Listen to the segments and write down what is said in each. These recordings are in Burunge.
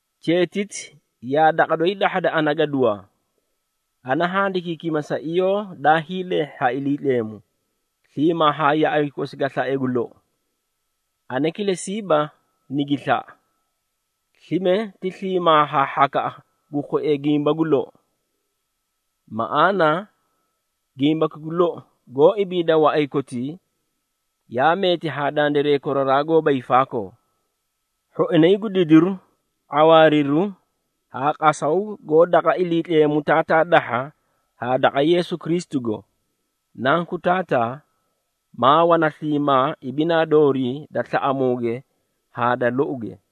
Cheetiti yaa daqa doyi dahhada ana gaduwaa. Ana handikiikima sa iyoo daay leehhi ha Iliitleemu, sliimaa haa yaꞌay kosi ga slae gu lou. Ana kilesiiba nigi slaꞌa, slime ti sliimaa haa hhakaꞌa gu khuee gimba gu lou. Maꞌaana, gimbaki gu lou goó ibiida waꞌay kotii, yaa meeti haa dandiray koraraa haa koraraa goóba hiifaakoo. Hhoinay gu didiru, ⁄awaariru haa qasaw goó daqa Iliitleemu Taataa dahha haa daqa Yeesu Kristugo, Nanku Taataa, maa wana sliimaa ibinaa doorii da slaꞌamuuge haa da louge.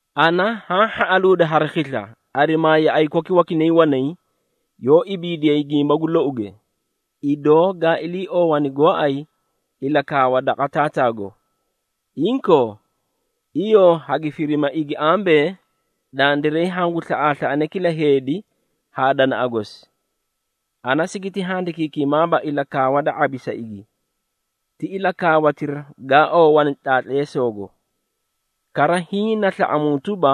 Ana haã hhaꞌaluudi hari khisla, arimaa yaꞌay koki wakinay wanay, yoó ibiidiyay gimba gu louge, idoo gaa iliioowani gooay ilakaawa daqa Taataago. Inkoo, iyoo hagi firima igi ambee, dandiray hangu slaꞌaaslaꞌane kila heedi haa danaꞌa gosi. Ana sigiti handikiikimaaba ilakaawa da ⁄abi sa igi, ti ilakaawatira gaa oowani tlaatleesoogo. Kara hiĩ na slaꞌamuu tuba,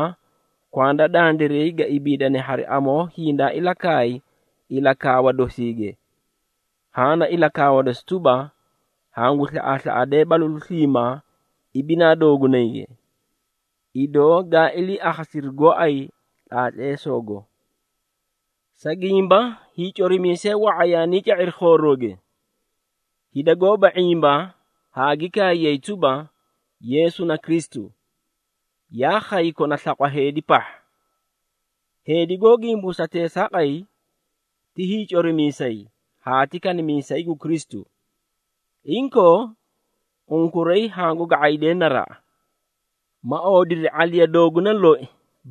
kwanda dandiray ga ibiidane hari amoo hindaa ilakaay ilakaawa dosiige. Haã na ilakaawa dosi tuba, hangu slaꞌaaslaꞌadee balalu sliimaa ibinaa doogunayge, idoo gaa ilii akhasidiri gooay tlaatleesoogo. Sa gimba, hiicorimiisee wa⁄a yaanii ca⁄iri khoorooge, hida goóba ⁄imba haa gi kaayay tuba, Yeesu na Kristu, yaa khay kona slaqwa heedi pahha. Heedi goó gimbuusa teesaaqay, ti hiicorimiisay haa ti kanimiisay gu Kristu. Inkoo, unkuray hangu ga⁄aydee naraꞌa, ma oodiri ⁄aliya dooguna loi,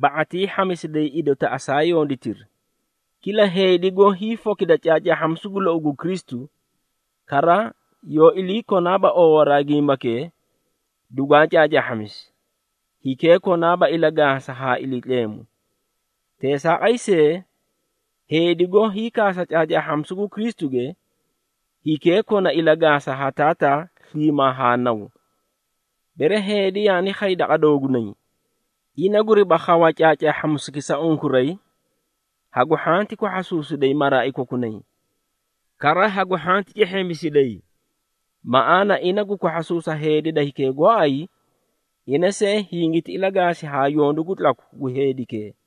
ba⁄atii hhamisiday idotaꞌa saa yonditiri, Kila heedi goó hiifokida caacaahhamisu gu lou gu Kristu, kara yoó ilakonaaba oowaraa gimbakee dugwaa caacaahhamisi, hikee konaaba ilagaasa haa Iliitleemu. Teesaaqay see, heedi goó hiikaasa caacaahhamisu gu Kristuge, hikee kona ilagaasa haa Taataa sliimaa haa Naw. Bere heedi yaani khay daqa doogunay, ina guriba khawa caacaahhamisuki sa unkuray, hagu hhanti kwahhasuusiday maraai kokunay, kara hagu hhanti cehheemisiday. Maꞌaana, ina gu kwahhasuusa heedi da hikee gooay, ina see hingiti ilagaasi haa yondu gu tlaku gu heedikee.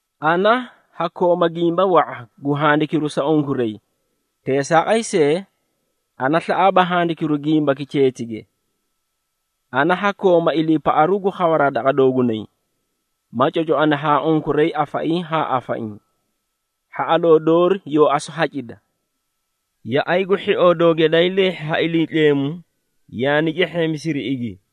Ana ha kooma gimba wa⁄a, gu handikiru sa unkuray, teesaaqay see, ana slaꞌaaba handikiru gimbaki cheetige. Ana ha kooma iliipaꞌaru gu khawaraa daqa doogunay, ma cocoani haa unkuray afaiĩ haa afaiĩ, hhaꞌaloo doori yoo asu hacida. Yaꞌay gu hhioo doogi daay leehhi ha Iliitleemu, yaani cehheemisiri igi.